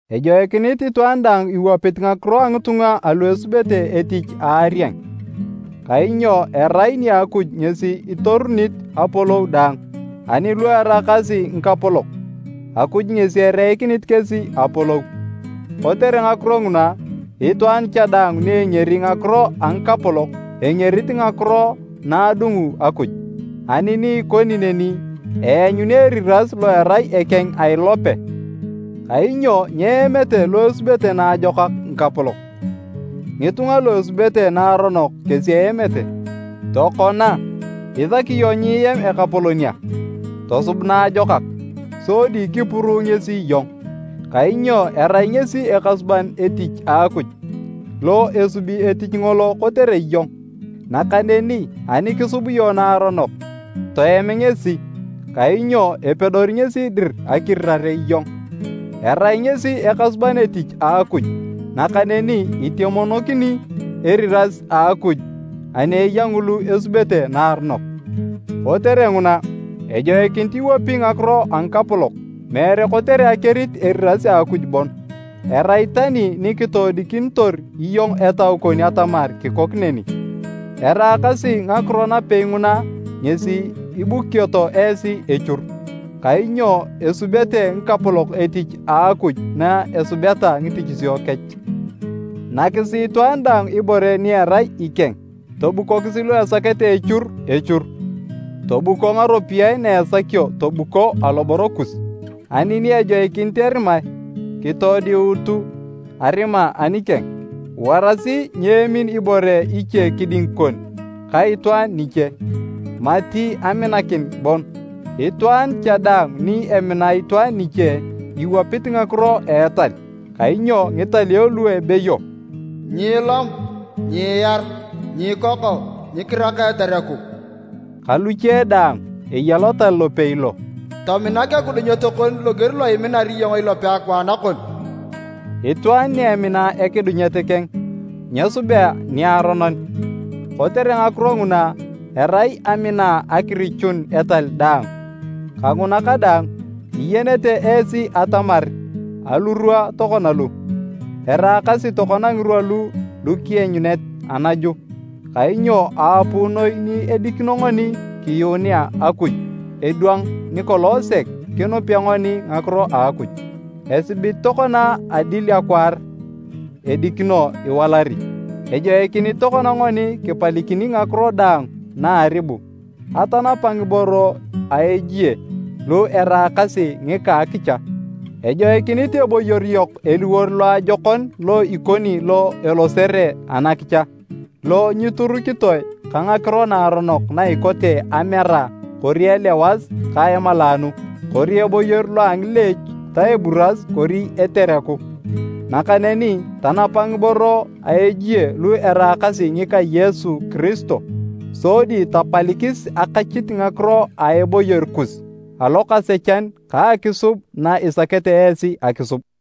Ejoikinit itwaan daang iwapit ngakiro a ngitunga alu esubete etich a arieng, kainyo erai nia Akuj ngesi itorunit apolou daang, ani lu eraakasi ngikapolok, Akuj ngesi ereikinit kesi apolou. Kotere ngakiro nguna, itwaan cha daang ni engeri ngakiro a ngikapolok, engerit ngakiro na adungu Akuj, ani ni ikoni neni, eanyuni eriras lo erai ekeng a ilope. Kainyo nyeemete lu esubete naajokak ngikapolok, ngitunga lu esubete naaronok kesi eemete. Tokona, isaki iyong nyiem ekapolon a? Tosub naajokak, sodi kipuruu ngesi iyong, kainyo erai ngesi ekasuban etich a Akuj, lo esubi etich ngolo kotere iyong. Nakaneni ani kisub iyong naaronok, toem ngesi, kainyo epedori ngesi dir akirirare iyong. Erai ngesi ekasuban etich a Akuj nakaneni itemonokini eriras a Akuj ani eya ngulu esubete naaronok. Kotere nguna, ejoikinit iwapi ngakiro a ngikapolok, meere kotere akerit eriras a Akuj bon, erai tani ni kitoodikinitor iyong etau kon atamar kikok neni. Eraakasi ngakiro napei nguna ngesi ibukioto esi echur, kainyo esubete ngikapolok etich a Akuj na esubeta ngitichisio kech. Nakisi itwaan daang ibore ni erai ikeng, tobukokisi lu esakete echur, echur, tobuko ngaropiyae na esakio tobuko aloboro kus, ani ni ejoikinit erimae, kitoodiutu arima anikeng. Warasi nyeemin ibore iche kiding kon ka itwaan niche, mati aminakin bon. Itwaan cha daang ni emina itwaan niche, iwapit ngakiro a etal. Kainyo ngitalio lu ebeyo, “Nyiilom, nyiiar, nyiikoko, nyikiraka etereku”, ka luche daang, eya lotal lopei lo, “Tominak ekidunyet kon loger lo iminar iyong ilope akwaan kon.” Itwaan ni emina ekidunyet keng, nyesubea niaronon. Kotere ngakiro nguna, erai amina akirichun etal daang. Kanguna kadaang, iyenete esi atamar alurwa tokona lu, eraakasi tokona ngirwa lu lukienyunet anaju, kainyo aapuu noi ni edikino ngoni kiyuunea Akuj edwang nikolong sek kinupea ngoni ngakiro a Akuj. Esibit tokona adil akwaar edikino iwalari. Ejoikinit tokona ngoni kipalikini ngakiro daang na a aribu, atanapa ngiboro a ejie lu eraakasi ngika a akicha. Ejoikinit eboyor yok eliwor loajokon lo ikoni lo elosere anakicha, lo nyiturukitoe ka ngakiro naaronok na ikote amera kori elewas ka emalaanu, kori eboyor lo a ngileech ta eburas kori etereku. Nakaneni tanapa ngiboro a ejie lu eraakasi ngika Yesu Kiristo, sodi tapalikis akachit ngakiro a eboyor kus alokasechan ka akisub na isakete esi akisub.